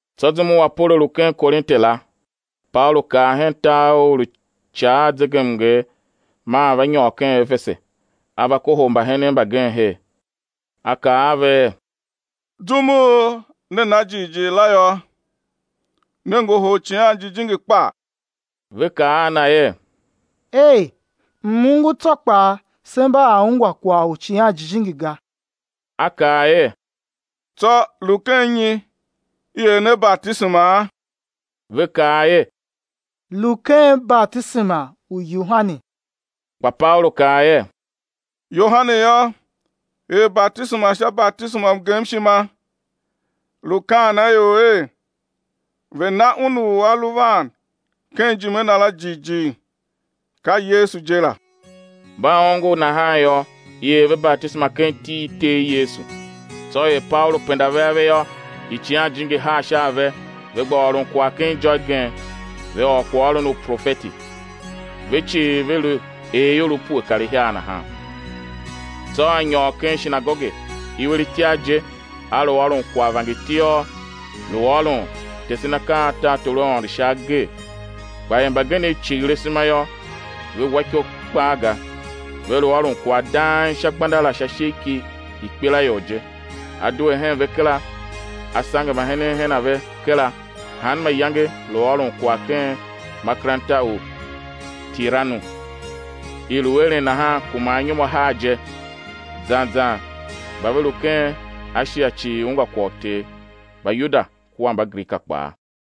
Tsô zum u Apolo lu ken Korinte la, Paulu kar hen tar u u lu ica a zegemnger maa va nyôr ken Efese, a va kohol mbahenen mbagenev her. A kaa a ve er: Zum u ne na jighjigh la yô, ne ngohol Icighan Jijingi kpa? Ve kaa a na er: Ei, m-ongo tsô kpaa se mba a ungwa kwagh u Icighan Jijingi ga. A kaa er: Tsô lu ken nyi i er ne batisemaa? Ve kaa er: Lu ken batisema u Yohane. Kpa Paulu kaa er: Yohane yô, er batisema sha batisema u mgemshima, lu kaan a ior er, ve̱ na Un u A lu van ken ijime na la jighjigh ka Yesu je la. Mba ongo nahan yô, i er ve batisema ken iti i Ter Yesu. Tsô er Paulu pende ave sha a ve yô, Icighan Jijingi haa sha a ve, ve gba ôron kwagh ken ijô igen, ve ôr kwaghôron u profeti. Ve cii ve lu er ior pue kar ihiar nahan. Tsô a nyôr ken shinagoge, iwer itiar je a lu ôron kwagh vangertiôr, lu ôron, tesen akaa a tartor u Aôndo sha agee. Kpa er mbagenev cighir asema yô, ve wa iko kpaa ga, ve lu ôron kwagh dang sha gbenda la sha ishigh ki ikpelaior je, a due hen ve kera, a sange mbahenen hen a ve kera, hanma iyange lu ôron kwagh ken makeranta u Tiranu. I lu eren nahan kuma anyom ahar je, zan zan mba ve lu ken Ashia cii ungwa kwagh u Ter, Mbayuda kua Mbagrika kpaa.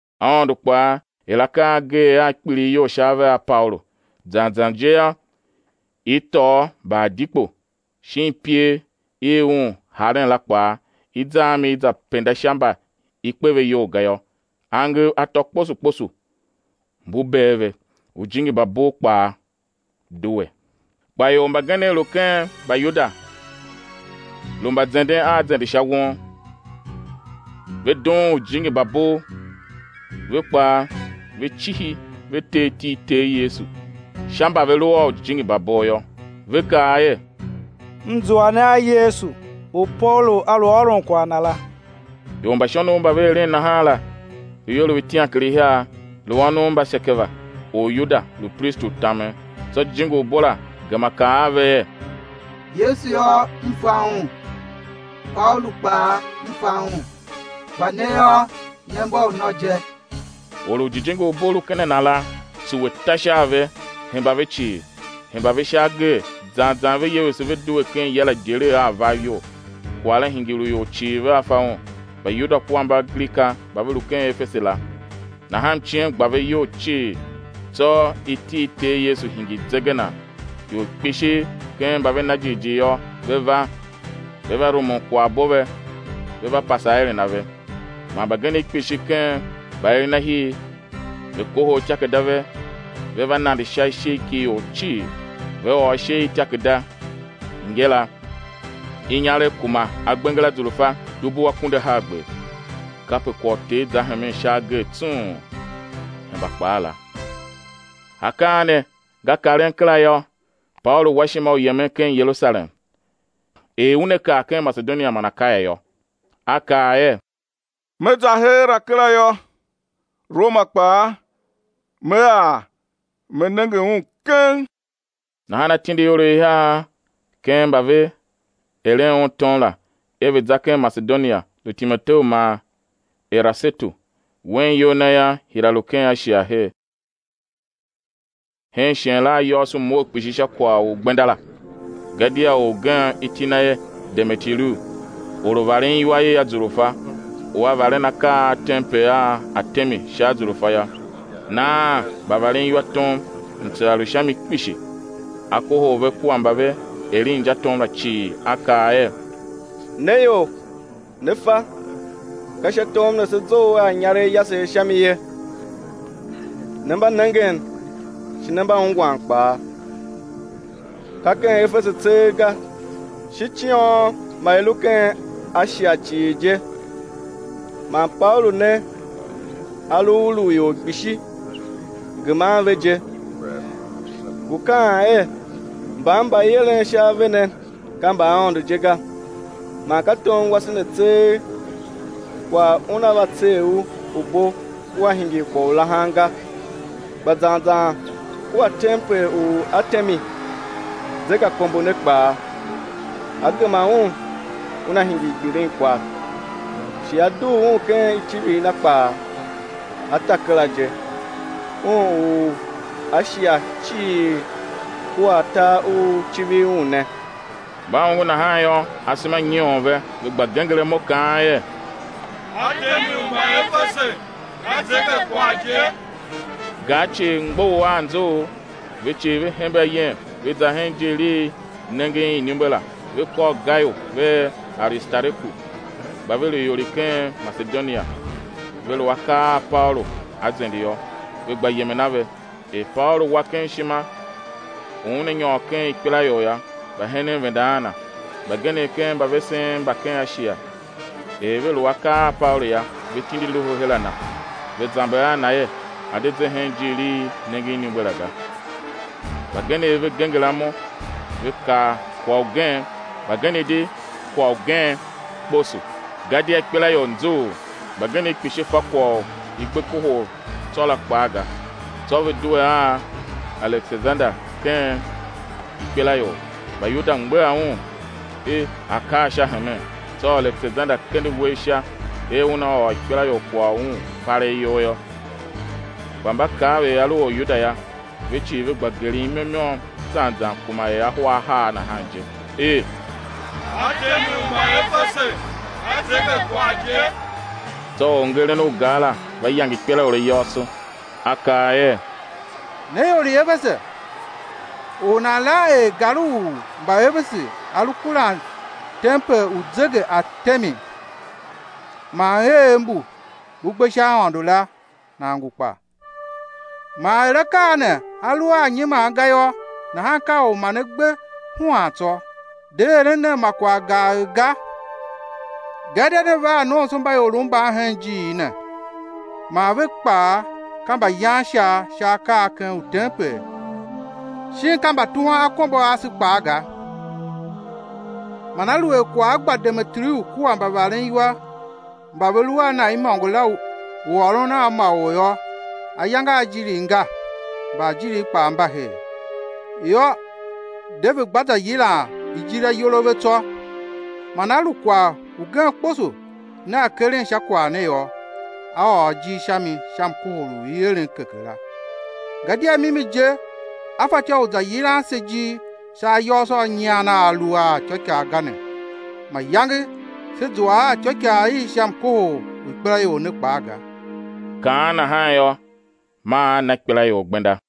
Aôndo kpaa er akaa a ageegh a kpilighyol sha ave a Paulu; zan zan je yô, i tôô mbaadikpo shin iper i un haren la kpaa, i za a mi i za penda sha mba i kpe ve iyol ga yô, angev atô kposo kposo mbu bee ve, ujijingi mba bov kpaa due. Kpa ior mbagenev lu ken Mbayuda lu mbazenden a zende sha won, ve dughun ujijingi mba bov, ve kpaa ve cihi ve ter iti i Ter Yesu sha mba ve lu a ujijingi mba bov, ve kaa er: M zua ne a Yesu u Paulu a lu ôron kwagh Na la. Ior mba shonov mba ve eren nahan la, lu ior itiankarihiar, lu ônov mba Sekeva, Oryuda, lu pristi u tamen. Tsô jijingi u bo la gema kaa a ve er: Yesu yô, m fa Un, Paulu kpaa m fa un, kpa ne yô, ne mba unô je? Or u jijingi u bo lu ken a na la, tsuwe, ta sha a ve, hemba ve cii, hemba ve sha agee, zan zan ve yevese ve due ken ya la idyelegh a avav iyol. Kwagh la hingir u ior cii vea fa un, Mbayuda kua Mbagrika mba ve lu ken Efese la; nahan mciem gba ve iyol cii, tsô iti i Ter Yesu hingir zegenan. Ior kpishi ken mba ve na jighjigh yô, ve va, ve va rumun kwaghbo ve, ve va pase aeren a ve. Man mbagenev kpishi ken mbaerenahir, ve kohol ityakerada ve, ve va nande sha ishigh ki ior cii, ve ôr ishe i ityakerada ngila, inyaregh kuma agbenger a azurfa dubu akunduahargber, kape kwagh u Ter zahemen sha agee tsung, hemba kpaa la. Akaa ne nga karen kera yô, Paulu wa ishima u yemen ken Yerusalem, er una kar ken Masedonia man Akaya yô; a kaa er: Me za heera kera yô, Roma kpaa me ar me nenge un keng. Nahan a tindi ior ihiar ken mba ve eren un tom la, er ve̱ za ken Masedonia, lu Timoteu man Erasetu; wen iyol na yô, hira lu ken Ashia her. Hen shighe la ayôôso mough kpishi sha kwagh u gbenda la. Gadia or ugen, iti na er Demeteriu, or u varen iwa i azurfa, u a varen akav a tempel u Artemi sha azurfa yô, naan mbavareniwa tom, mtsera lu sha mi kpishi. A kohol ve kua mba ve eren injatom la cii a kaa er: Ne ior, ne fa, ka sha tom ne se zough a inyaregh yasegh mi ye; ne mba nengen, shi ne mba ungwan kpaa, ka ken Efese tseegh ga, shi ciôn ma i lu ken Ashia cii je man Paulu ne a lu ulugh ior kpishi, geman ve je, ngu kaan er, mban mba i eren sha ave ne ka mbaaôndo je ga. Man ka tom wase ne tseegh kwagh una va tser u u bo ua hingir kwagh u lahan ga, kpa zan zan kua tempel u Artemi, zegeakombo ne kpaa, á gema un, una hingir gbilinkwagh, shi á dugh un ken icivir na kpaa, á ta kera je, un u Ashia cii kua tar u civir un ne. Mba ongo nahan yô, asema nyoon ve, ve gba genger imo, kaan er: Artemi u Mbaefese ka zegekwagh je! Gar cii mgbough a anzughul, ve cii ve hembe ayem ve za hen ijiir i nengen iniumbe la, ve kôr Gayu vea Aristareku, mba ve lu ior i ken Masedonia, ve lu akar a Paulu a zende yô, ve gba yemen a ve. Er Paulu wa ken ishima u una nyôr ken ikpelaior yô, mbahenen venda a na. Mbagenev ken mbavesen mba ken Ashia, er ve lu akar a Paulu yô, ve tindi loho her a na, ve zamber a na er, a̱ de ze hen ijiir i nengen iniumbe la ga. Mbagenev ve genger imo ve kaa kwagh ugen, mbagenev di kwagh ugen kposo, gadia ikpelaior nzughul, mbagenev kpishi fa kwagh u i gbe kohol tsô la kpaa ga. Tsô ve due a Alekesander ken ikpelaior, Mbayuda mgbegha un er a̱ kar sha hemen. Tsô Alekesander kende uwegh sha er una ôr ikpelaior kwagh una palegh iyol yô. Kpa mba kav er a lu Oryuda yô, ve cii ve gba geren imo i môm zan zan kuma er ahwa ahar nahan je, er: Artemi u Mbaefese ka zegekwagh je! Tsô orngeren u gar la va yange ikpelaior ayôôso, a kaa er: Ne ior i Efese, or u nan lan er gar u Mbaefese a lu kuran tempel u zegeartemi man eev mbu mbu gbe sha aôndo la, nan ngu kpa? Man er akaa ne a lu a nyiman ga yô, nahan ka u ma ne gbe huan tsô, de eren nen ma kwagh gagh ga. Gadia ne va a nomsombaiorov mban hen ijiir ne, man ve kpaa ka mbayan ishar sha akaa a ken utempel shin ka mbatuhwan akombo a ase kpaa ga. Man aluer kwagh a gba Demeteriu kua mbavareniwa mba ve lu a na imôngo la, u ôron a ma or yô, ayange a ajirigh nga, mbaajiriv kpaa mba her; yô, de, ve̱ gba za yilan ijir ayol a ve tsô. Man a lu kwagh ugen kposo nea keren sha kwagh ne yô, á ôr ijir sha mi sha mkohol u i eren keke la. Gadia mimi je á fatyô u za yilan se ijir sha ayôôso a nyian a a lu a ityôikaa ga ne; mayange sé zua a ityôikaa i sha mkohol u ikpelaior ne kpaa ga. Kaan nahan yô, maa a na ikpelaior gbenda.